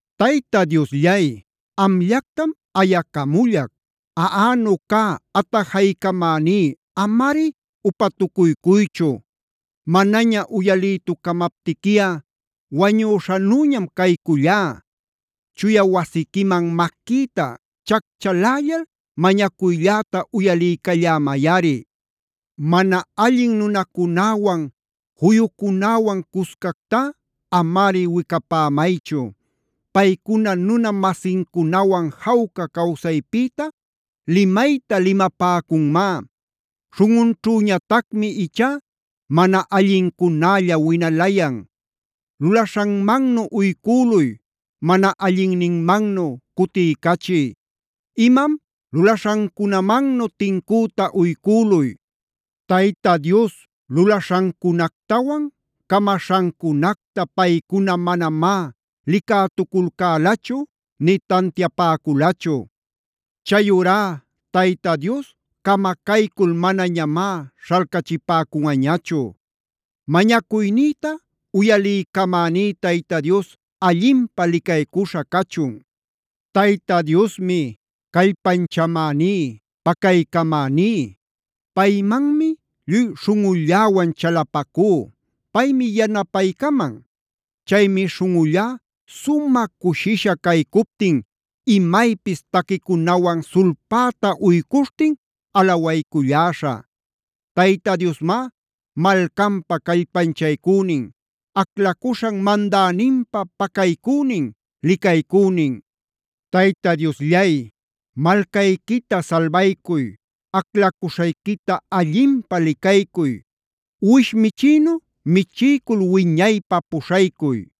Tayta Diosllay, amllactam ayacamullac. Aꞌanu cä atajaycamäní amari upatucuycuychu. Manaña uyalïtucamaptiquiꞌa wañüśhanüñam caycullá. Chuya wasiquiman maquïta chacchalällal mañacuylläta uyaliycallämayꞌari. Mana allin nunacunäwan, juyucunäwan cuscactá amari wicapämaychu. Paycuna nuna-masincunawan jawca cawsaypïta limayta limapäcunmá. Śhunꞌunćhüñatacmi ichá mana allincunälla winalayan. Lulaśhanmannu uycüluy, mana allinninmannu cutiycachiy.a Imam lulaśhancunamannu tincüta uycüluy. Tayta Dios lulaśhancunactawan camaśhancunacta paycuna manamá licätuculcälachu nï tantiapäculachu. Chayurá Tayta Diosmi camacaycul manañamá śhalcachipäcunꞌañachu. Mañacuynïta uyaliycamäní Tayta Dios allinpä licaycuśha cachun. Tayta Diosmi callpanchamäní, pacaycamäní. Paymanmi lluy śhunꞌulläwan chalapacú; paymi yanapaycaman. Chaymi śhunꞌullá sumä cushisha caycuptin imaypis taquicunawan sulpäta uycuśhtin alawayculläśhä. Tayta Diosmá malcanpa callpanchaycünin. Aclacuśhan mandäninpä pacaycünin, licaycünin. Tayta Diosllay, malcayquita salbaycuy. Aclacuśhayquita allinpä licaycuy. Uwish michïnu michiycul wiñaypä puśhaycuy.